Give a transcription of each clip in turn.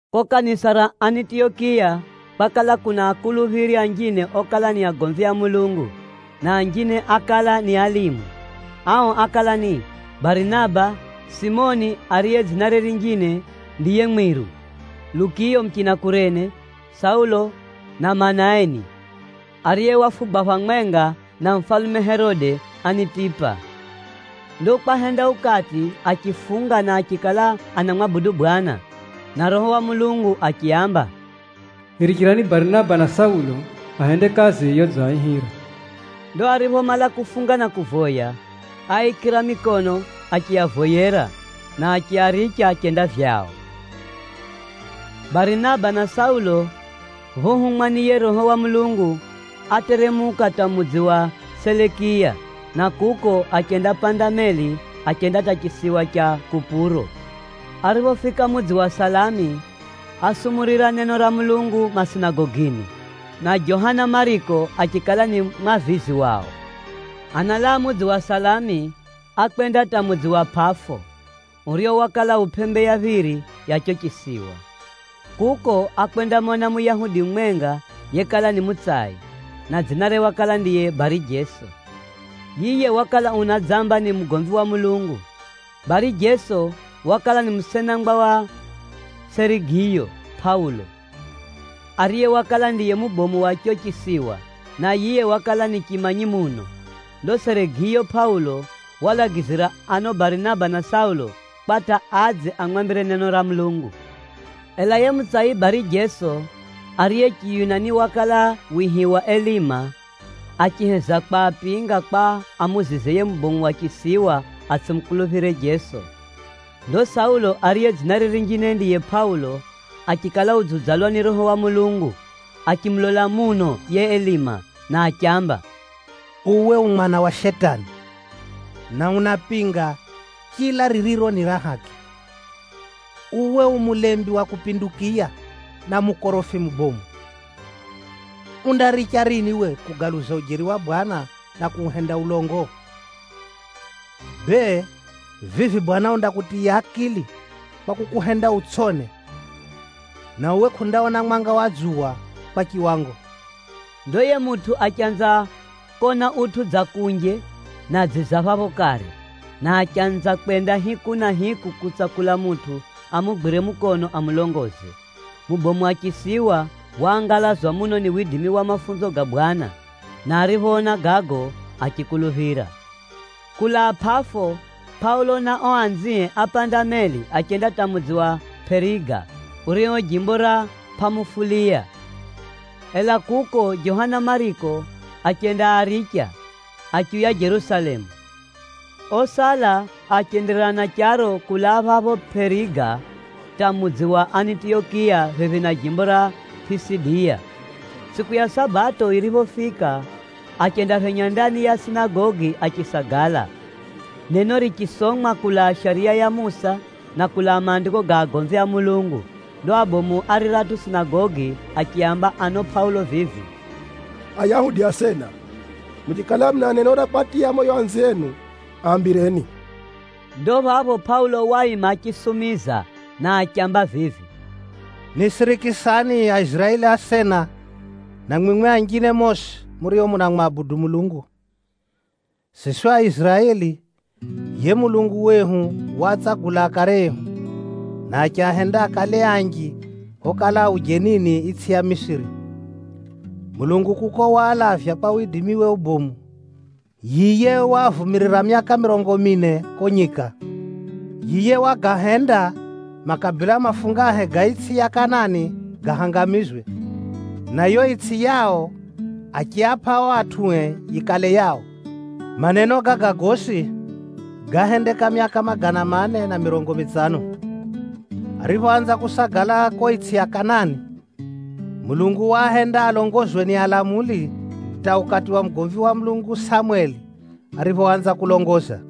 Ko kanisa ra Anitiyokiya, kwakala kuna akuluphiri anjine okala ni agomvi a Mulungu, na anjine ákala ni alimu. Ao ákala ni: Barinaba, Simioni ariye dzinare rinjine ndiye Mwiru, Lukiyo muchina Kurene, Saulo na Manaeni, ariye wafugwa phamwenga na mufalume Herode Anitipa. Ndo kwahenda ukati achifunga na achikala anamwabudu Bwana, na Roho wa Mulungu achiaamba, “Nirichirani Barinaba na Saulo, ahende kazi yodziaihira.” Ndo ariphomala kufunga na kuvoya, áaikira mikono achiavoyera, na achiaricha achenda vyao. Barinaba na Saulo phohumwa ni yiye Roho wa Mulungu, áteremuka hata mudzi wa Selekiya, na kuko achendapanda meli achenda hata chisiwa cha Kupuro. Ariphofika mudzi wa Salami, ásumurira neno ra Mulungu masinagogini, na Johana Mariko achikala ni mwavizi wao. Analaa mudzi wa Salami, ákwenda hata mudzi wa Pʼafo, urio wakala u pʼembe ya phiri ya chicho chisiwa. Kuko, ákwendamona Muyahudi mumwenga yekala ni mutsai, na dzinare wakala ndiye Bari-Jeso. Yiye wakala unadzamba ni mugomvi wa Mulungu. Bari-Jeso wakala ni musenangwa wa Serigiyo Pʼaulo, ariye wakala ndiye mubomu wa chicho chisiwa, na yiye wakala ni chimanyi muno. Ndo Serigiyo Pʼaulo waalagizira ano Barinaba na Saulo, kwa hata adze amwambire neno ra Mulungu. Ela yiye mutsai Bari-Jeso, ariye Chiyunani wakala wihiwa Elima, achiheza kwapinga kwa amuzize yiye mubomu wa chisiwa atsʼimukuluphire Jeso. Ndo Saulo ariye dzinare rinjine ndiye Pʼaulo achikala udziudzalwa ni Roho wa Mulungu, achimulola muno yiye Elima na achiamba, “Uwe u mwana wa Shetani, na unapinga chila ririro ni ra haki. Uwe u mulembi wa kupindukiya, na mukorofi mubomu! Undaricha rini uwe kugaluza ujeri wa Bwana na kuuhenda ulongo? Bee, vivi Bwana undakutiya akili kwa kukuhenda utsʼone, na uwe kʼundawona mwanga wa dzuwa kwa chiwango.” Ndo yiye mutʼu achanza kona utʼu dza kunje na dziza phapho kare, na achanza kwenda hiku na hiku kutsakula mutʼu amugwire mukono amulongoze. Mubomu wa chisiwa waangalazwa muno ni widimi wa mafunzo ga Bwana, na ariphoona gago, achikuluphira. Kulaa Pʼafo, Pʼaulo na ao anzie ápanda meli achenda hata mudzi wa Pʼeriga, urio jimbo ra Pʼamufuliya. Ela kuko, Johana Mariko achendaaricha, achiuya Jerusalemu. Osala achenderera na charo kulaa phapho Pʼeriga hata mudzi wa Anitiyokiya phephi na jimbo ra Pʼisidiya. Tsʼiku ya Sabato yiriphofika, achendaphenya ndani ya sinagogi achisagala. Neno richisomwa kulaa Shariya ya Musa, na kulaa Maandiko ga agomvi a Mulungu. Ndo abomu a riratʼu sinagogi achiaamba ano Pʼaulo vivi, “Ayahudi asena, muchikala muna neno ra kwatiya moyo anzienu, aambireni.” Ndo phapho Pʼaulo waima achisumiza na achiamba vivi, “Nisirikisani Aiziraeli asena na mwimwi anjine mosi murio munamwabudu Mulungu! Siswi Aiziraeli yiye Mulungu wehu waatsagula akare ehu, na achiahenda akale anji phokala a ujenini itsʼi ya Misiri. Mulungu kuko waalavya kwa widimiwe ubomu. Yiye waavumirira myaka mirongo mine ko nyika. Yiye Wagahenda makabila mafungahe ga itsʼi ya Kanani gahangamizwe, na yo itsʼi yao achiapʼa o atʼue yikale yao. Sam 3:20Maneno gaga gosi gáhendeka myaka magana mane na mirongo mitsano. “Ariphoanza kusagala ko itsʼi ya Kanani, Mulungu waahenda alongozwe ni alamuli hata ukati wa mugomvi wa Mulungu Samweli ariphoanza kulongoza.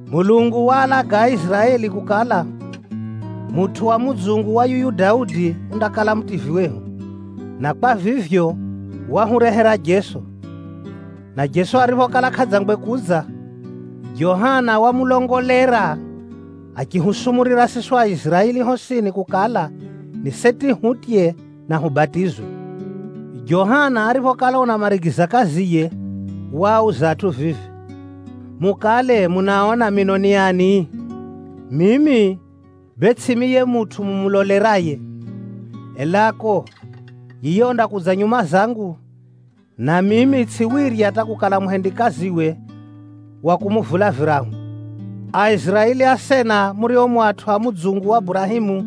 Mulungu waalaga Aiziraeli kukala, mutʼu wa mudzungu wa yuyu Daudi undakala Mutivyi wehu, na kwa vivyo, wahurehera Jeso. Na Jeso ariphokala kʼadzangwe kudza, Johana wamulongolera achihusumurira siswi Aiziraeli hosini kukala, ni seti hutye na hubatizwe. Johana ariphokala unamarigiza kaziye, waauza atʼu vivi, ‘Mukale munaona mino ni ani? Mimi bee tsʼimi yiye mutʼu mumuloleraye. Elako, yiye undakudza nyuma zangu, na mimi tsʼiwirya hata kukala muhendikaziwe wa kumuvula virahu.’ “Aiziraeli asena murio mu atʼu a mudzungu wa Burahemu,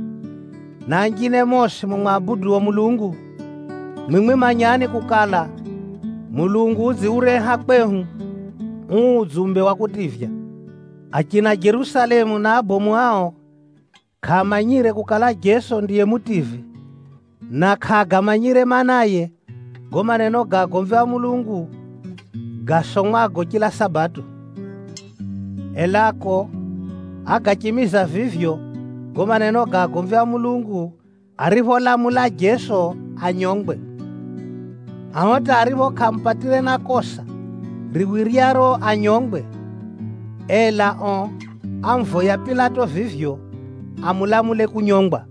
na anjine mosi mumwabuduo Mulungu, mwimwi manyani kukala, Mulungu udziureha kwehu uu udzumbe wa kutivya! Achina Jerusalemu na abomu ao kʼaamanyire kukala Jeso ndiye Mutivyi, na kʼaagamanyire maanaye gago maneno ga agomvi a Mulungu gasomwago chila Sabato. Elako, ágachimiza vivyo gago maneno ga agomvi a Mulungu aripholamula Jeso anyongwe. Ao hata aripho kʼaamupatire na kosa riwiryaro anyongwe, ela ao ámuvoya Pilato vivyo amulamule kunyongwa.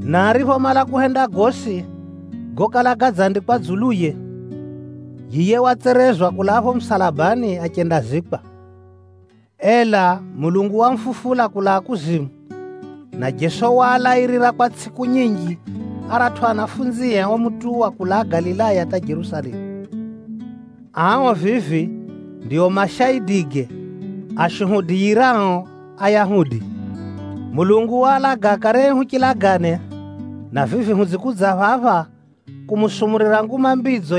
Na ariphomala kuhenda gosi gokala gadzandikwa dzuluye, yiye watserezwa kulaa pho musalabani, achendazikwa. Ela Mulungu wamufufula kulaa kuzimu, na Jeso waalairira kwa tsʼiku nyinji aratʼu anafunzie omutuwa kulaa Galilaya hata Jerusalemu. Ao vivi, ndio mashaidige ashuhudiyirao Ayahudi. Mulungu waalaga akare ehu chilagane, na vivi hudzikudza phapha, kumusumurira Nguma Mbidzo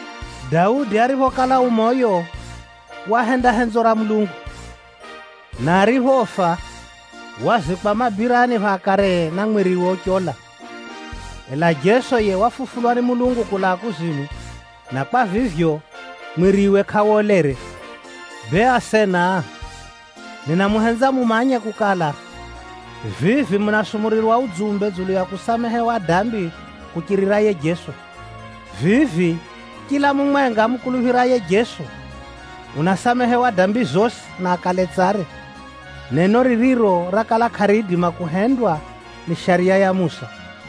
“Daudi ariphokala u moyo, wahenda henzo ra Mulungu. Na ariphofa, wazikwa mabirani pha akaree, na mwiriwe uchola. Ela Jeso yiye wafufulwa ni Mulungu kulaa kuzimu, na kwa vivyo, mwiriwe kʼawolere. “Bee asena, ninamuhenza mumanye kukala, vivi munasumurirwa udzumbe dzulu ya kusamehewa dambi kuchirira yiye Jeso. Vivi chila mumwenga amukuluphiraye Jeso, unasamehewa dambi zosi na akale tsare, neno ririro rakala kʼariidima kuhendwa ni Shariya ya Musa.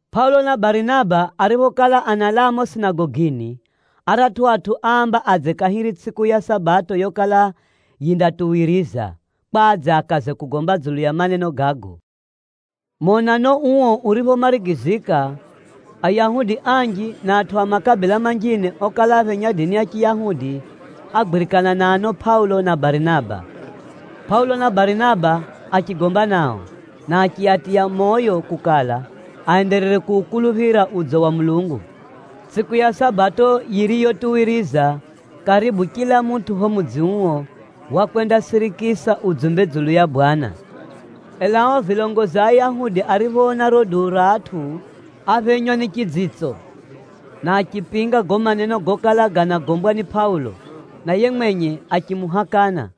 Pʼaulo na Barinaba ariphokala analaa mumo sinagogini, aratʼu atʼu áamba adze kahiri tsʼiku ya Sabato yokala yindatuwiriza, kwa adze akaze kugomba dzulu ya maneno gago. Monano uo uriphomarigizika, Ayahudi anji, na atʼu a makabila manjine okala aphenya dini ya Chiyahudi, ágwirikana na ano Pʼaulo na Barinaba. Pʼaulo na Barinaba achigomba nao, na achiatiya moyo kukala, aenderere kuukuluphira udzo wa Mulungu. Tsʼiku ya Sabato yiriyotuwiriza, karibu chila mutʼu phapho mudzi uo, wakwendasirikisa udzumbe dzulu ya Bwana. Ela ao vilongozi a Ayahudi ariphoona riro duu ra atʼu, áphenywa ni chidzitso, na achipinga gago maneno gokala ganagombwa ni Pʼaulo, na yiye mwenye achimuhakana.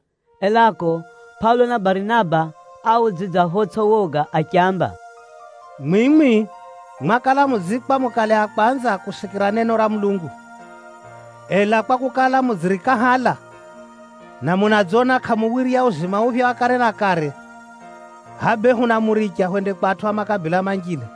Elako, Pʼaulo na Barinaba áaudzidza photsʼi woga achiamba, “Mwimwi mwakala mudziikwa mukale a kwanza kusikira neno ra Mulungu. Ela kwakukala, mudzirikahala na munadzona kʼamuwirya uzima uphya wa kare na kare, hʼaya bee hunamuricha hwende kwa atʼu a makabila manjine.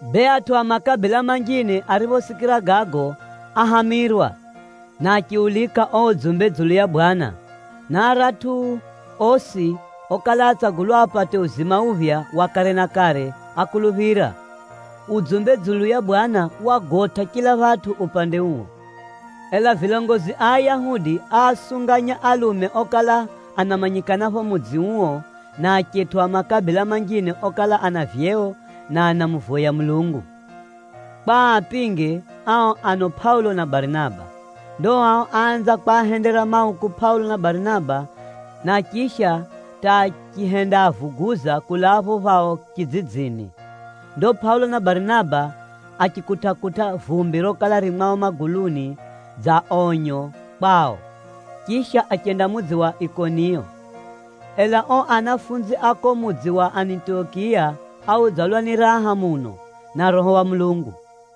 Bee, atʼu a makabila manjine ariphosikira gago, áhamirwa, na achiulika uo udzumbe dzulu ya Bwana. Na aratʼu osi okala átsagulwa apate uzima uphya wa kare na kare, ákuluphira. Udzumbe dzulu ya Bwana wagotʼa chila phatʼu upande uo. Ela vilongozi a Ayahudi áasunganya alume okala anamanyikana phapho mudzi uo na achetʼu a makabila manjine okala ana vyeo na anamuvoya Mulungu, kwa aapinge ao ano Pʼaulo na Barinaba. Ndo ao áanza kwahendera mauku Pʼaulo na Barinaba, na chisha hata achihendaavuguza kulaa phapho phao chidzidzini. Ndo Pʼaulo na Barinaba achikutʼa-kutʼa vumbi rokala ririro mwao maguluni kwaonyesa kukala andamanya enye, chisha achenda mudzi wa Ikoniyo. Ela ao anafunzi a kuko mudzi wa Anitiyokiya áudzalwa ni raha muno, na Roho wa Mulungu.